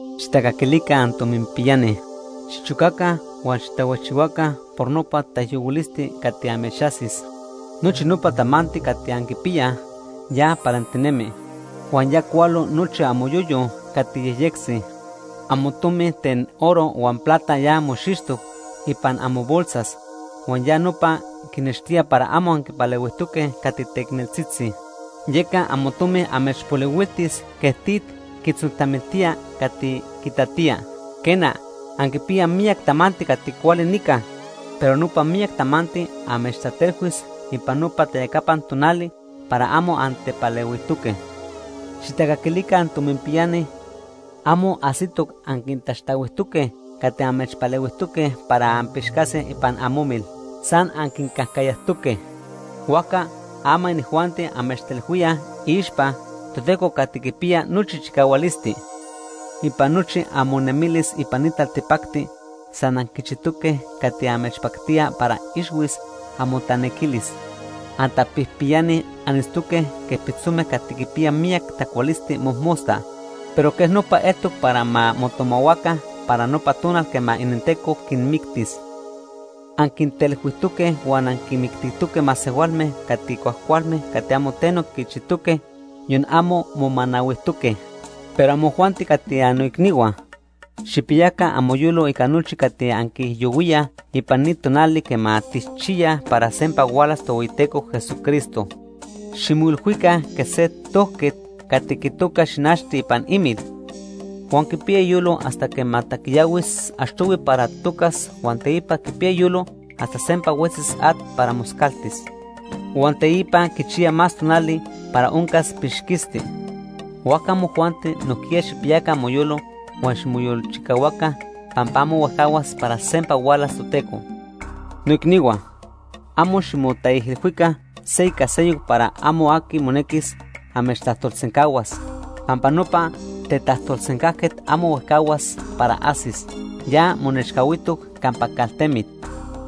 Xijtacaquilica antominpiyani. Xichocaca huan xitahuejchihuaca por nopa taijyohuilisti cati amechajsis. Nochi nopa tamanti cati anquipiyaj, ya palantinemi; huan ya cualo nochi amoyoyo cati yejyectzi. Amotomi ten oro huan plata ya moxixtoc ipan amobolsas, huan ya nopa quinextía para amo anquinpalehuijtoque cati teicneltzitzi. Yeca amotomi amechpolihuiltis quej tit quitzontamiltía cati quitatía. Quena, anquipiyaj miyac tamanti cati cuali nica, pero nopa miyac tamanti amechtatelhuis ipan nopa tayacapan tonali para amo antepalehuijtoque. Xijtacaquilica antominpiyani, amo ajsitoc anquintaxtahuijtoque cati amechpalehuijtoque para anpixcase ipan amomil. San anquincajcayajtoque. Huajca ama inijuanti amechtelhuíaj iixpa Toteco Cati Quipiya Nochi Chicahualisti. Ipan nochi amonemilis ipan ni taltipacti, san anquichijtoque cati amechpactía para ixhuis amotanequilis. Antapijpiyani anitztoque quej pitzome cati quipiyaj miyac tacualisti mojmosta. Pero quej nopa eltoc para ma motomahuaca para nopa tonal quema ininteco quinmictis. Anquintelhuijtoque huan anquinmictijtoque masehualme cati cuajcualme cati amo teno quichijtoque, yon amo momanahuijtoque. Pero amojuanti cati annoicnihua, xijpiyaca amoyolo ica nochi cati anquiijyohuíaj ipan ni tonali quema tijchiyaj para sempa hualas Tohueyiteco Jesucristo. Ximoilhuica quej se tojquet cati quitoca xinachti ipan imil, huan quipiya iyolo hasta quema taquiyahuis achtohui para tocas huan teipa quipiya iyolo hasta sempa huetzis at para moscaltis. Huan teipa quichiya más tonali para oncas pixquisti. Huajca amojuanti nojquiya xijpiyaca amoyolo huan ximoyolchicahuaca pampa amo huejcahuas para sempa hualas Toteco. Noicnihua, amo ximotaijilhuica se ica seyoc para amo aqui monequis amechtajtolsencahuas, pampa nopa tetajtolsencajquet amo huejcahuas para ajsis. Ya monechcahuijtoc campa caltemit.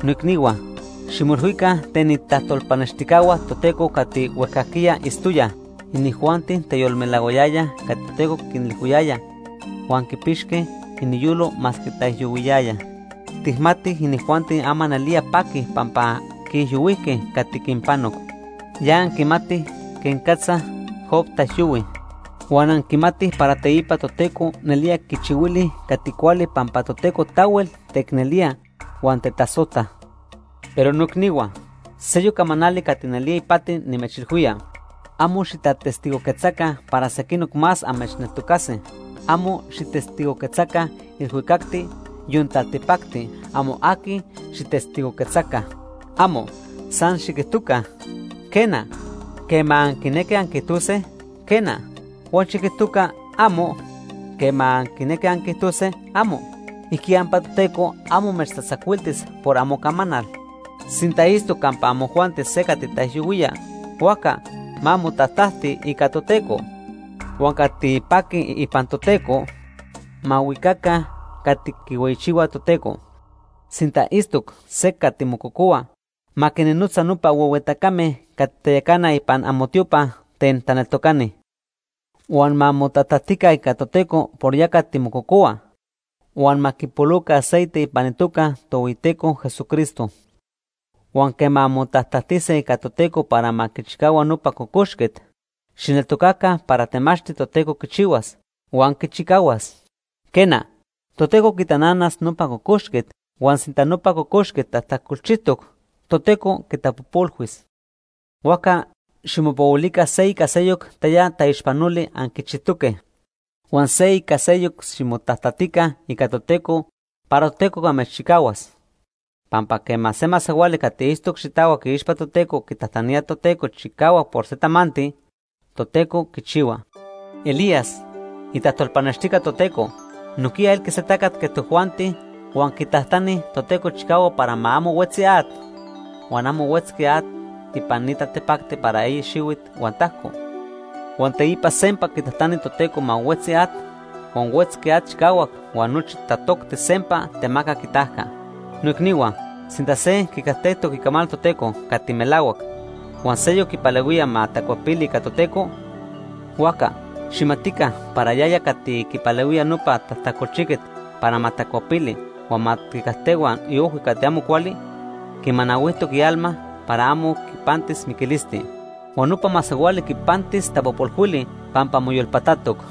Noicnihua, ximoilhuica ten itajtolpanextijcahua Toteco cati huejcajquiya itztoyaj. Inijuanti tayolmelahuayayaj cati Toteco quinilhuiyaya huan quipixque iniyolo masque taijyohuiyayaj. Tijmatij inijuanti ama nelía paquij pampa quiijyohuijque cati quinpanoc. Ya anquimatij quenicatza Job taijyohui. Huan anquimatij para teipa Toteco nelía quichihuili cati cuali pampa Toteco tahuel teicnelía huan tetasojta. Pero noicnihua, seyoc camanali cati nelía ipati nimechilhuía. Amo xitatestigojquetzaca para sequinoc más amechneltocase. Amo xijtestigojquetzaca ilhuicacti, yon taltipacti. Amo aqui xijtestigojquetzaca. ¡Amo! San xiquijtoca “quena” quema anquinequij anquiijtose, “quena”. Huan xiquijtoca “amo” quema anquinequij anquiijtose “amo”. Ijquiyampa Toteco amo amechtatzacuiltis por amocamanal. Sinta itztoc campa amojuanti se cati taijyohuía, huajca ma motatajti ica Toteco. Huan cati paquij ipan Toteco, ma huicaca cati quihueyichihua Toteco. Sinta itztoc se cati mococohua, ma quinnotza nopa huehue tacame cati tayacanaj ipan amotiopa ten taneltocani, huan ma motatajtica ica Toteco por ya cati mococohua, huan ma quipoloca aceite ipan itoca Ica itequiticayo. Tohueyiteco Jesucristo. Huan quema anmotatajtise ica Toteco para ma quichicahua nopa cocoxquet, xijneltocaca para temachti Toteco quichihuas, huan quichicahuas. Quena, Toteco quitananas nopa cocoxquet huan sinta nopa cocoxquet tajtacolchijtoc, Toteco quitapojpolhuis. Huajca ximopohuilica se ica seyoc taya taixpanoli anquichijtoque. Huan se ica seyoc ximotatajtica ica Toteco para Toteco amechchicahuas. Pampa quema se masehuali cati itztoc xitahuac iixpa Toteco quitajtanía Toteco chicahuac por se tamanti, Toteco quichihua. Elías, itajtolpanextijca Toteco, nojquiya elqui se tacat quej tojuanti huan quitajtani Toteco chicahuac para ma amo huetzi at. Huan amo huetzqui at ipan ni taltipacti para eyi xihuit huan tajco. Huan teipa sempa quitajtani Toteco ma huetzi at, huan huetzqui at chicahuac huan nochi tatocti sempa temacac itajca. Noicnihua, sinta se quicajtejtoc Icamanal Toteco cati melahuac, huan seyoc quipalehuía ma tacuepili ica Toteco, huajca xijmatica para yaya cati quipalehuía nopa tajtacolchijquet para ma tacuepili huan ma quicajtehua iojhui cati amo cuali, quimanahuijtoc ialma para amo quipantis miquilisti. Huan nopa masehuali quipantis tapojpolhuili pampa moyolpatatoc.